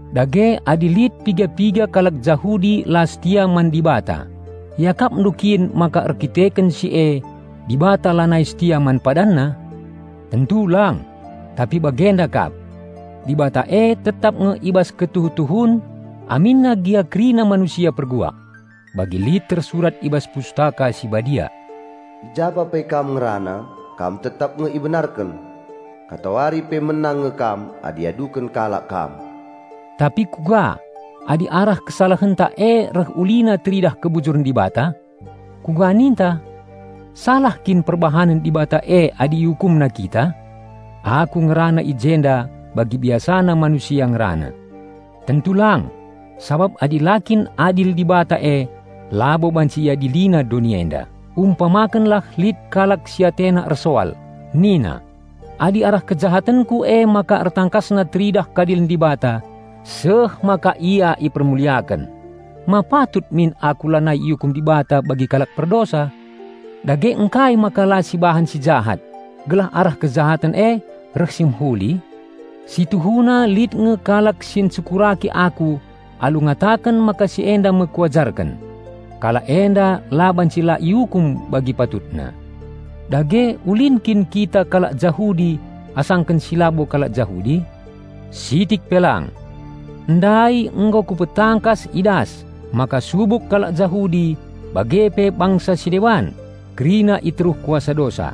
Dage adi lit piga-piga kalak Jahudi la setia man Dibata, iakapndu kin maka erdandanken si e Dibata lanai setia man PadanNa? Tentu lang! Tapi bagenda kap. Dibata e tetap nge i bas ketuhu-tuhun aminna gia kerina manusia perbual. Bagi lit tersurat i bas Pustaka Si Badia, "I japa pe Kam ngerana, Kam tetap nge ibenarken. Katawari pe menang nge Kam, adi iaduken kalak Kam." Tapi kuga, adi arah kesalahenta e reh ulina teridah kebujuren Dibata? Kuga ninta? Salah kin perbahanen Dibata e adi iukumna kita? (Aku ngerana i jenda bagi biasana manusia ngerana.) Tentu lang! Sabap adi la kin adil Dibata e, labo banci iadilina doni enda. Umpamakenlah lit kalak si atena ersoal, nina, "Adi arah kejahatenku emaka ertangkasna teridah keadilen Dibata seh maka la ipermuliaken, ma patut min aku lanai iukum Dibata bagi kalak perdosa? Dage ngkai maka la sibahan si jahat, gelah arah kejahaten e reh si mehuli?" Si tuhuna lit nge kalak si encekuraki aku alu ngataken maka si enda me kuajarken. Kalak enda la banci la iukum bagi patutna. Dage, ulin kin kita kalak Jahudi asangken si labo kalak Jahudi? Sitik pe lang! Ndai nggo kupetangkas i das maka subuk kalak Jahudi bage pe bangsa si deban kerina i teruh kuasa dosa.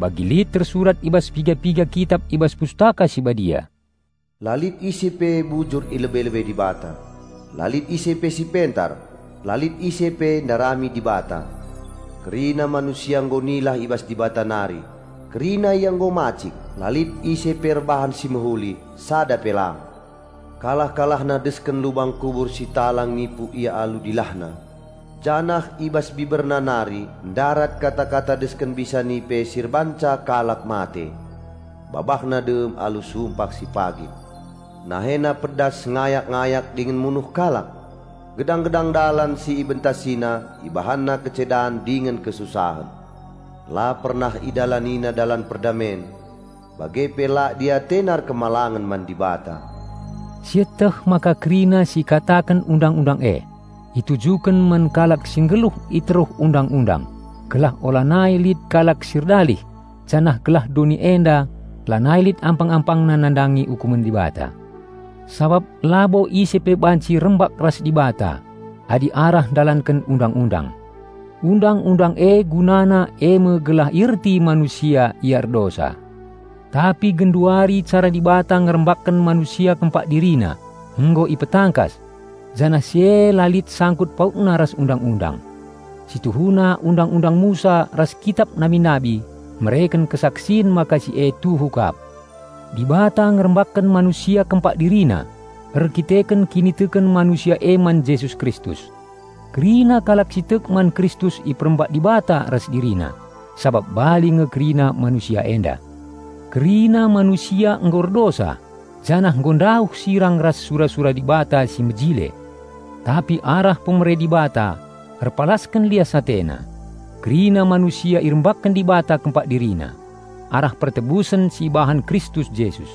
Bagi lit tersurat i bas piga-piga kitap i bas Pustaka Si Badia, "La lit ise pe bujur i lebe-lebe Dibata, la lit ise pe si pentar, la lit ise pe ndarami Dibata. Kerina manusia nggo nilah i bas Dibata nari; kerina ia nggo macik; la lit ise pe erbahan si mehuli, sada pe lang. Kalah-kalahna desken lubang kubur si talang nipu ia alu dilahna, janah i bas biberna nari ndarat kata-kata desken bisa nipe si erbahanca kalak mate. Babahna dem alu sumpah pagit. Nahena pedas ngayak-ngayak dingen munuh kalak. Gedang-gedang dalan si ibentasina, ibahana kecedan dingen kesusahen. La pernah idalanina dalan perdamen. Bage pe la diatena erkemalangen man Dibata." Sieteh maka kerina si ikataken Undang-undang e, itujuken man kalak si nggeluh i teruh Undang-undang, gelah ulanai lit kalak si erdalih janah gelah doni enda lanai lit ampang-ampangna nandangi ukumen Dibata. Sabap labo ise pe banci rembak ras Dibata adi arah ndalanken Undang-undang. Undang-undang e gunana eme gelah ierti manusia ia erdosa. Tapi genduari cara Dibata ngerembakken manusia kempak DiriNa nggo ipetangkas, janah si e la lit sangkut pautna ras Undang-undang. (Si tuhuna Undang-undang Musa ras kitap nabi-nabi mereken kesaksin maka si e tuhu kap.) Dibata ngerembakken manusia kempak DiriNa erdandanken kiniteken manusia e man Jesus Kristus. Kerina kalak si tek man Kristus iperembak Dibata ras DiriNa sabap bali nge kerina manusia enda. Kerina manusia nggo erdosa janah nggo ndauh sirang ras sura-sura Dibata si mejile. Tapi arah pemere Dibata erpalasken lias AteNa, kerina manusia irembakken Dibata kempak DiriNa, arah pertebusen si ibahan Kristus Jesus.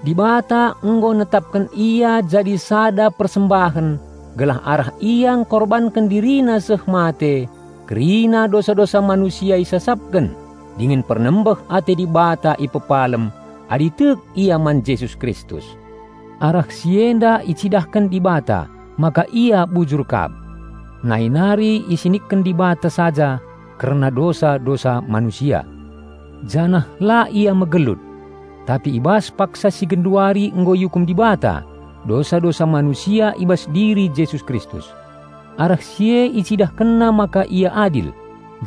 Dibata nggo netapken Ia jadi sada persembahen gelah arah Ia engkorbanken DiriNa seh mate, kerina dosa-dosa manusia isasapken dingen pernembeh ate Dibata ipepalem, adi tek ia man Jesus Kristus. Arah si enda icidahken Dibata maka Ia bujur kap. Nai nari isinikken Dibata saja kerna dosa-dosa manusia, janah la Ia megelut. Tapi i bas paksa si genduari nggo iukum Dibata dosa-dosa manusia i bas diri Jesus Kristus. Arah si e IcidahkenNa maka Ia adil,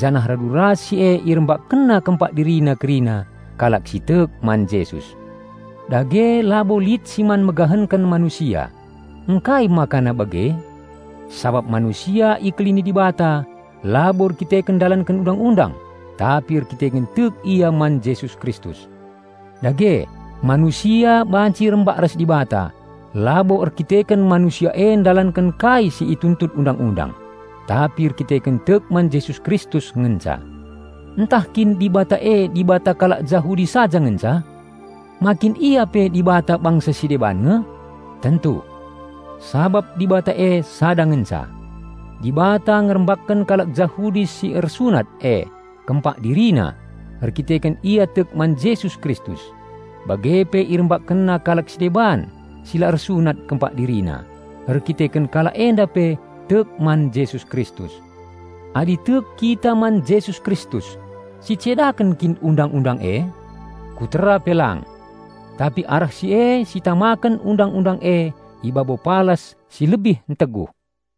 janah radu ras si e IrembakkenNa kempak DiriNa kerina kalak si tek man Jesus. Dage labo lit si man megahenken manusia. Ngkai makana bage? Sabap manusia ikelini Dibata labo erdandanken ndalanken Undang-undang, tapi erdandanken tek ia man Jesus Kristus. Dage, manusia banci rembak ras Dibata labo erdandanken manusia e ndalanken kai si ituntut Undang-undang, tapi erdandanken tek man Jesus Kristus ngenca. Ntah kin Dibata e Dibata kalak Jahudi saja ngenca? Ma kin Ia pe Dibata bangsa si deban nge? Tentu. Sabap Dibata e sada ngenca. Dibata ngerembakken kalak Jahudi si ersunat e kempak DiriNa erdandanken ia tek man Jesus Kristus; bage pe IrembakkenNa kalak si deban si la ersunat kempak DiriNa erdandanken kalak enda pe tek man Jesus Kristus. Adi tek kita man Jesus Kristus, sicedaken kin Undang-undang e? Kutera pe lang! Tapi arah si e sitamaken Undang-undang e i babo palas si lebih enteguh.